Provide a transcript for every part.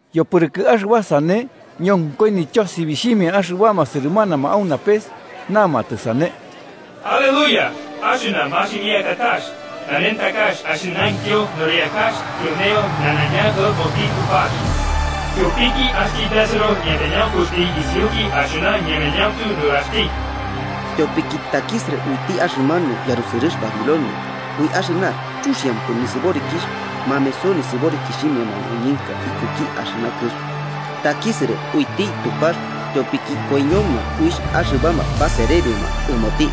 Yopɨrɨkɨ axɨba sane, ñonkoi nityosibixhimia axɨbama sɨrɨmanama au napes namatɨ sane: “¡Aleluya! Axɨna maximikatax, nanentakax axɨnaintyo nɨriakax tyoneio nanaiña ɨmoti Tupax. Tyopiki axti besɨro ñapanaunkuxti isiuki axɨna ñemanauntu nuraxti. Tyopiki takisɨrɨ uiti axɨmanu yarusɨrɨx Babilonia ui axɨna chuxiampɨ nisɨborikixh mameso nisɨborikixhimia mañoñɨnka ikuki axɨna kɨx. Takisɨrɨ uiti Tupax tyopiki koiñoma uixh axɨbama baserebioma ɨmoti.”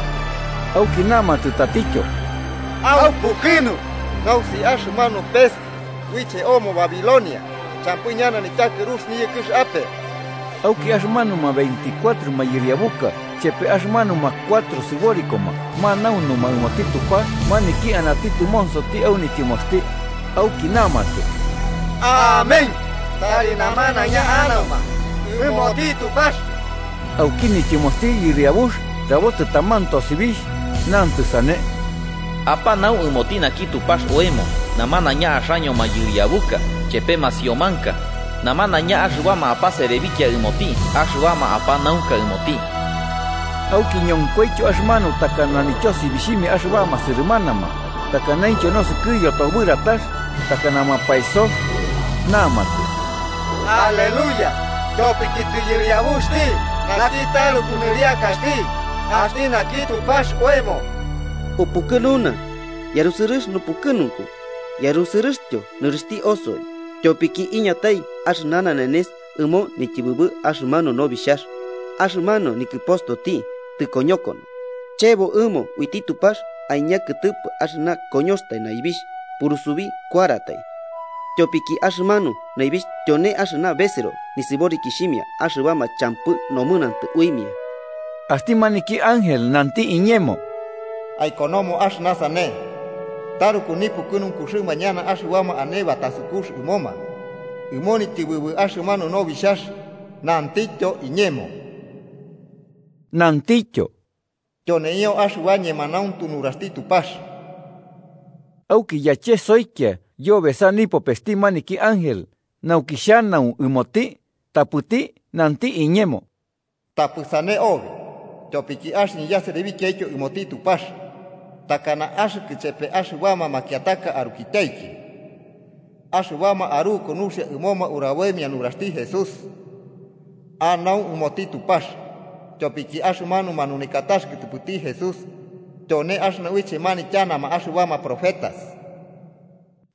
Auki namatɨ tatityo: “¡Aupukɨnu! Nausi axɨmanu pes uiche omo Babilonia champɨ ñana nityakɨru niyɨkɨx ape.” Auki axɨmanuma veinticuatro mayɨriabuka chepe axɨmanuma cuatro sɨborikoma manaunuma ɨmoti Tupax maniki anati tɨmonsoti au nityɨmoxti. Auki namatɨ: “¡Amén! ¡Tari namanaiña anauma ɨmoti Tupax!” Auki nityɨmoxti Yɨriabux rabotɨ taman tosibixh, nantɨ sane: “¡Apanau ɨmoti naki Tupax oemo namanaiña axaño mayɨriabuka chepe masiomanka, namanaiña axɨbama apaserebikia ɨmoti axɨbama apanaunka ɨmoti!” Auki ñonkoityo axɨmanu takana nityosibixhimia axɨbama sɨrɨmanama, takanaintyo nosɨkɨ yotobɨratax takana mapaesox. Namatɨ: “¡Aleluya! Tyopiki tɨyɨriabuxti naki taruku Nɨriakaxti, axti naki Tupax oemo. Upukɨnuna, yarusɨrɨx nupukɨnunku yarusɨrɨxtyo nɨrixhti osoi, tyopiki iñatai axɨna nanenes ɨmo nityɨbɨbɨ axɨmanu Nobixhax. Axɨmanu nikɨpostoti tɨkoñokono: chebo ɨmo uiti Tupax aiña kɨtɨpɨ axɨna koñoxtai naibixh, purusubi kuaratai, tyopiki axɨmanu naibixh tyone axɨna besɨro nisɨborikixhimia axɨbama champɨ nomɨnantɨ uimia.” Axti maniki ángel nanti iñemo: “Aikonomo axɨna sane: ‘Taruku nipukɨnunkuxɨma ñana axɨbama ane batasukux ɨmoma ɨmo nityɨbɨbɨ axɨmanu Nobixhax. Nantityo iñemo.’” Nantityo: “Tyoneio axɨba ñemanauntu nuraxti Tupax.” Auki yachesoikia yobesa nipopesti maniki ángel, nauki xhanau ɨmoti, tapɨti nanti iñemo: “Tapɨ sane obi, tyopiki axɨñɨ yaserebikiaityo ɨmoti Tupax, takana axɨkɨ chepe axɨbama makiataka arukityaiki, axɨbama aruku nuxia ɨmoma uraboimia nuraxti Jesús. Anau ɨmoti Tupax.” Tyopiki axɨmanu manunekakax kɨtɨpɨti Jesús, tyone axɨna uiche manityanama axɨbama profetas.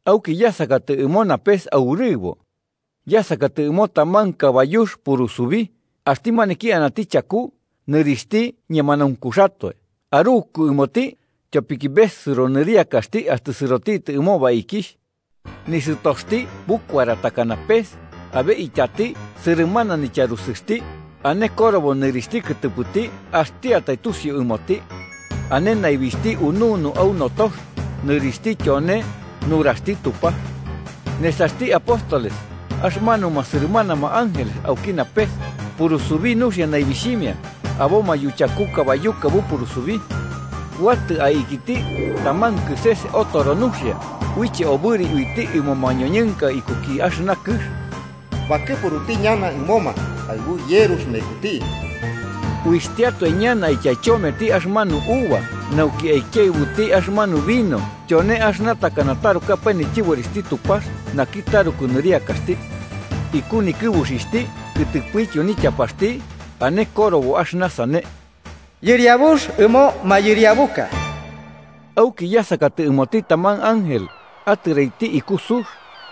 Auki yasakatɨ ɨmo napes aurɨbo. Yasakatɨ ɨmo taman kabayux purusubi, axti maniki anati chaku, nɨrixhti Ñemanaunkuxatoe Aruku ɨmoti, tyopiki besɨro nɨriakaxti axtɨ sɨrotitɨ ɨmo baikixh. Nisɨtoxti bukuara takana pes, abe ityati sɨrɨmana nityarusɨxti, ane korobo nɨrixhti kɨtɨpɨti axtiatai tusiu ɨmoti. Ane naibixhti ununu au notox, nɨrixhti tyone: Nuraxti Tupax. Nesaxti apóstoles axɨbama sɨrɨmana ángeles auki napes, purusubi nuxia naibixhimia, aboma yuchaku kabayuka bupurusubi. Kuatɨ aikiti taman kɨses otoro nuxia, uiche obɨri uiti ɨmo mañoñɨnka ikuki axɨna kɨx. Bakɨpuruti ñana ɨmoma aɨbu yerux mekuti. Uixhtiatoe ñana aityaichometi axɨmanu uva nauki aikiaɨbuti axɨmanu vino tyone axɨna takana tarukapae nityɨborixhti Tupax naki taruku nɨriakaxti. Iku nikɨbuxixhti kɨtɨpɨtyo nityapaxti ane korobo axɨna sane: “Yɨriabux ɨmo mayɨriabuka.” Auki yasakatɨ ɨmoti taman ángel, atɨraiti iku sux,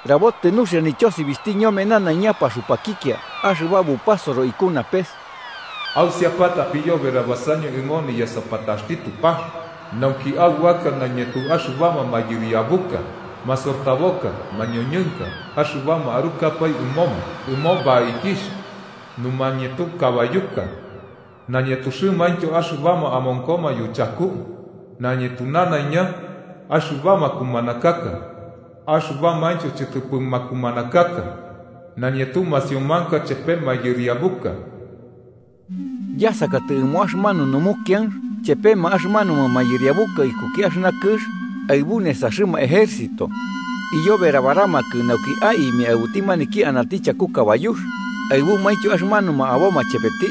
rabotɨ nuxia nityosibixhti ñome nanaiña paxupakikia axɨba bupasoro iku napes: “¡Ausiapata apiyoberabasaño ɨmo niyasapataxti Tupax, nauki aubaka nañetu axɨbama mayɨriabuka, masortaboka mañoñɨnka axɨbama arukapae ɨmoma ɨmo baikixh, numañetu kabayuka nañetuxɨmaintyo axɨbama amonkoma yuchaku, nañetu namanaiña: axɨbama kumanakaka axɨbamaintyo chɨtɨpɨ makumanakaka, nañetu masiomanka chepe mayɨriabuka!” Yasakatɨ ɨmo axɨmanu numukianx chepema axɨmanuma mayɨriabuka ikuki axɨna kɨx aɨbu nesaxɨma ejército, iyoberabaramakɨ nauki aimia aɨbuti maniki anati chaku kabayux aɨbumaintyo axɨmanuma aboma chepeti.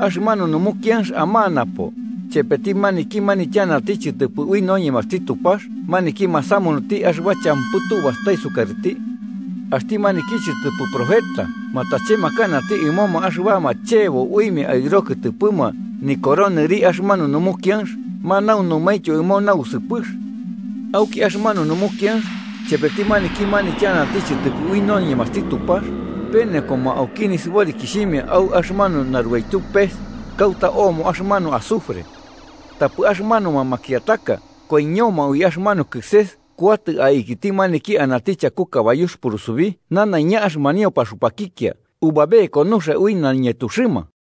Axɨmanu numukianx amanapo, chepeti maniki manityanati chɨtɨpɨ ui noñemaxti Tupax maniki masamunuti axɨba champɨ tubastai sukarɨti. Axti maniki chɨtɨpɨ profeta matachemakanati ɨmoma axɨbama chebo uimia aɨro kɨtɨpɨma nikoro nɨri axɨmanu numukianx manaunumaintyo ɨmo nausɨpɨx. Auki axɨmanu numukianx chepeti maniki manityanati chɨtɨpɨ ui noñemaxti Tupax penekoma auki nisɨborikixhimia au axɨmanu narubaityu pes kauta omo axɨmanu azufre. Tapɨ axɨmanuma makiataka koiñoma ui axɨmanu kɨses kuatɨ aikiti maniki anati chaku kabayux purusubí, nanaiña axɨmanio paxupakikia ubabeko nuxia ui nañetuxɨma.